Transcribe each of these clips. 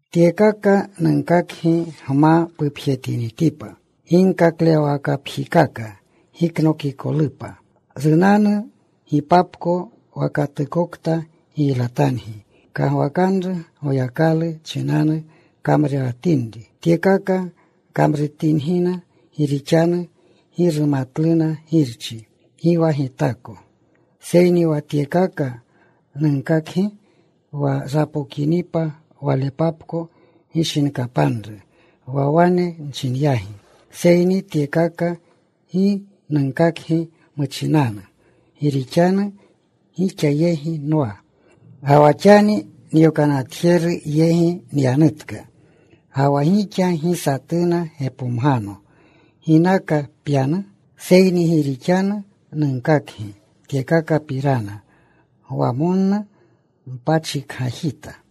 “Tyekaka nunkakgi gma pupjetinitipa. Ginkaklewwakapjikaka giknokikolupa. Runanu gipapko wa katukokta giylatangi kagwakanru Goyakalu chinanu kamrurewatinri. Tyekaka kamrutingina gi rixanu gi rumatluna Girchi, gi wa Gitako. Seyni wa tyekaka nunkakgi, wa rapokinipa walepapko gishinkapanru wa wane nchinyagi. Seyni tyekaka gi nunkakgi muchinanu, gi rixanu gixa yegi nwa. Ga wa xani nyokanatjeru yegi nyanutka, ga wa gixa gi satuna gepomgano, ‘¿Ginaka pyanu?’ Seyni gi rixanu nunkakgi tyekakapirana gwamonnu mpachikgajita.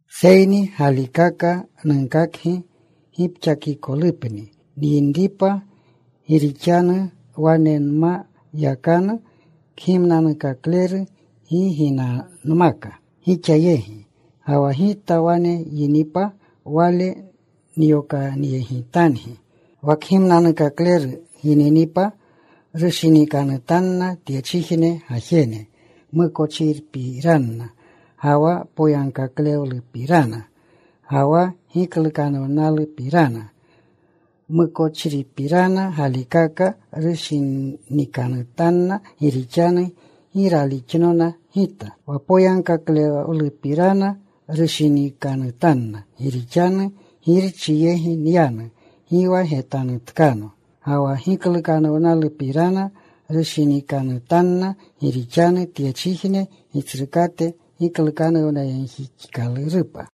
“Seyni galikaka nunkakgi gipxakikolupni nyinripa, gi rixanu wane nma yakanu Kgimnanukakleru gi ginanmaka gixa yegi. Ga wa Gita wane yinipa, Wale nyokanyegitangi. Wa Kgimnanukakleru gininipa rushinikanutanna tyechijne gajene mukochripirana, ga wa poyagkaklewlupirana, ga wa giklukanuwlupirana. Mukochripirana galikaka rushinikanutanna, gi rixanu gi ralixnona Gita. Wa poyagkaklewlupirana rushinikanutanna, gi rixanu Girchi yegi nyanu. Gi wa getanutkano. Ga wa giklukanuwlupirana rushinikanutanna, gi rixanu tyechijne gitsrukate giklukanuwnayegjixkalurupa.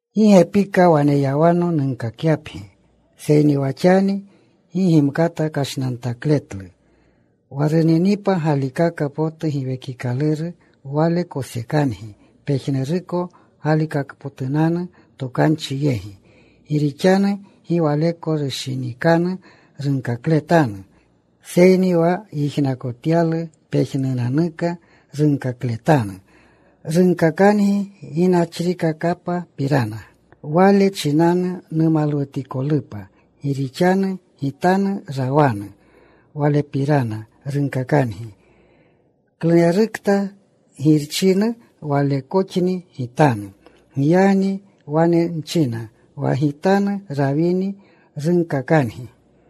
“Gi gepika waneyawano nunkakyapgi, seyni xani gi gimkata kashnantakletlu. Wa runinipa galikaka potu Giwekikaluru Wale kosekangi pejnuruko Galikakpotunanu Tokanchi yegi. Gi rixanu gi Waleko rushinikanu runkakletanu, seyni wa yijnakotyalu pejnunanuka runkakletanu. Runkakangi ginachrikakapapirana. Wale chinanu numalwutikolupa, gi rixanu Gitanu rawanu. Walepirana runkakangi. Klunerukta Girchinu walekoxni Gitanu. Giyagni wane nchina wa Gitanu rawini, runkakangi.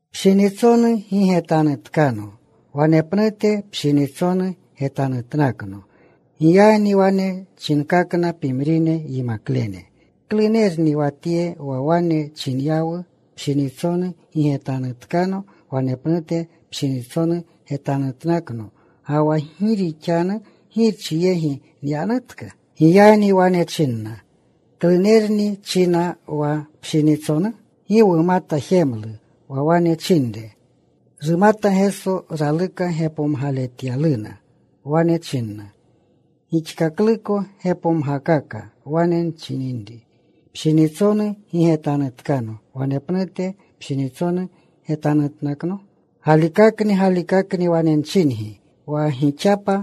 “Pshinitsonu gi getanutkano. Wanepnute pshinitsonu, getanutnakno.” Giyagni wane chinkakna pimrine yimaklene, “¿Klunerni wa tye wa wane chinyawu, ‘Pshinitsonu gi getanutkano. Wanepnute pshinitsonu getanutnakno.’ Ga wa ‘gi rixanu Girchi yegi nyanutka?’” Giyagni wane chinna, “¿Klunerni china, wa ‘pshinitsonu?’ Gi wumata jemlu wa wane chinre.” Rumata Geso raluka gepomgaletyaluna. Wane chinna, “¿Gixkakluko gepomgakaka wane nchininri, ‘Pshinitsonu gi getanutkano. Wanepnute pshinitsonu, getanutnakno?’ Galikakni, galikakni wane nchingi, wa gixapa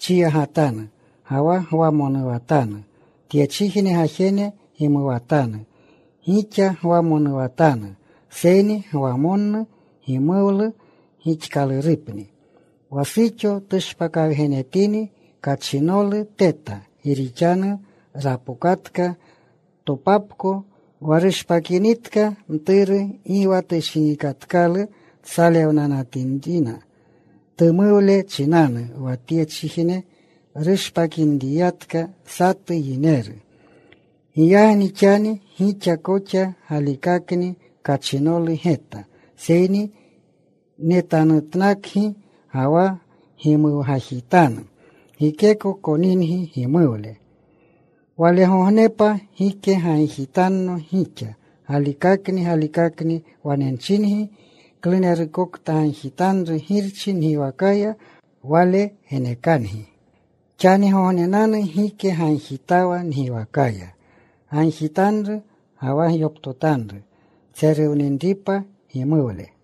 chiyagatanu, ga wa gwamonuwatanu. Tyechijne gajene gimuwatanu. Gixa gwamonuwatanu, seyni gwamonnu gimuwlu gixkalurupni. Wa suxo tushpakawugenetini, kachinolu teta gi rixanu rapokatka topapko. Wa rushpakinitka mturu gi wa tushinikatkalu tsalewninrinanu, tumuwle chinanu wa tyechijne rushpakinriyatka satu yineru. Giyagni xani gixa koxa galikakni kachinolu geta. Seyni netanutnakgi ga wa gimuwgajitanu. Gikeko koningi gimuwle. Walegognepa gike gagjitanno gixa. Galikakni, galikakni wane nchingi, klunerukokta gagjitanru Girchi ngiwakaya Wale genekangi. Xanigognenanu gike gagjitawa ngiwakaya. Gagjitanru ga wa gyoptotanru tseruwninripa gimuwle.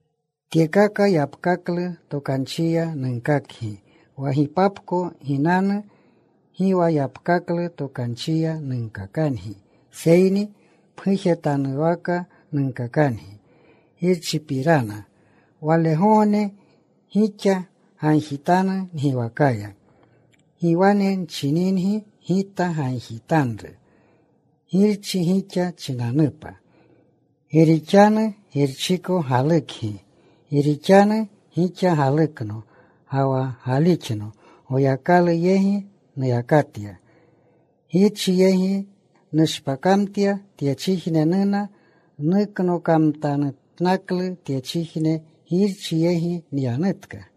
“Tyekaka yapkaklu tokanchiya nunkakgi. Wa gipapko ginanu, gi wa yapkaklu tokanchiya nunkakangi. Seyni pgujetanwaka nunkakangi Girchipirana. Walegogne gixa gagjitanu ngiwakaya. Gi wane nchingi Gita gagjitanru Girchi gixa chinanupa. Gi rixanu Girchiko galukgi gi rixanu gixa galukno, ga wa galixno Goyakalu yegi nuyakatya. Girchi yegi nushpakamtya. Tyechijne nuna. Nuknokamtanutnaklu tyechijne. Girchi yegi nyanutka.”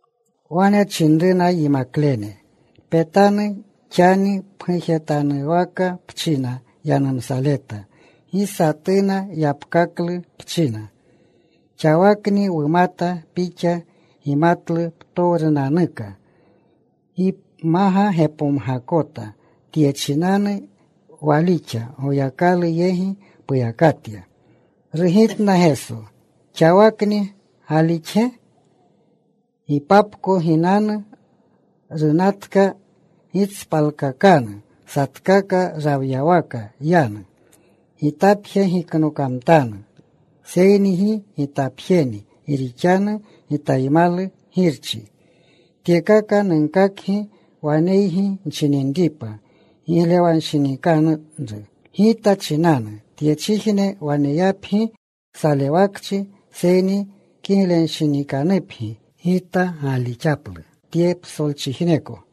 Wane chinruna yimaklene, “Petanu. Xani pgujetanuwaka pchina yanumsaleta. Gi satuna yapkaklu pchina. Xawakni wumata Pixa gimatlu ptowrunanuka. Gi pmaga gepomgakota. Tye chinanu walixa Goyakalu yegi puyakatya.” Rugitna Geso, “¿Xawakni galixge? Gipapko ginanu, runatka, gitspalkakanu. Satkaka rawyawaka yanu. Gitapje giknokamtanu. Seyni gi Gitapjeni, gi rixanu Gitaymalu Girchi. “Tyekaka nunkakgi waneygi nchininripa giglewanshinikanru Gita chinanu. Tyechijne waneyapgi salewakchi. Seyni kiglenshinikanupgi. Gita gaalixaplu tye psolchijneko.”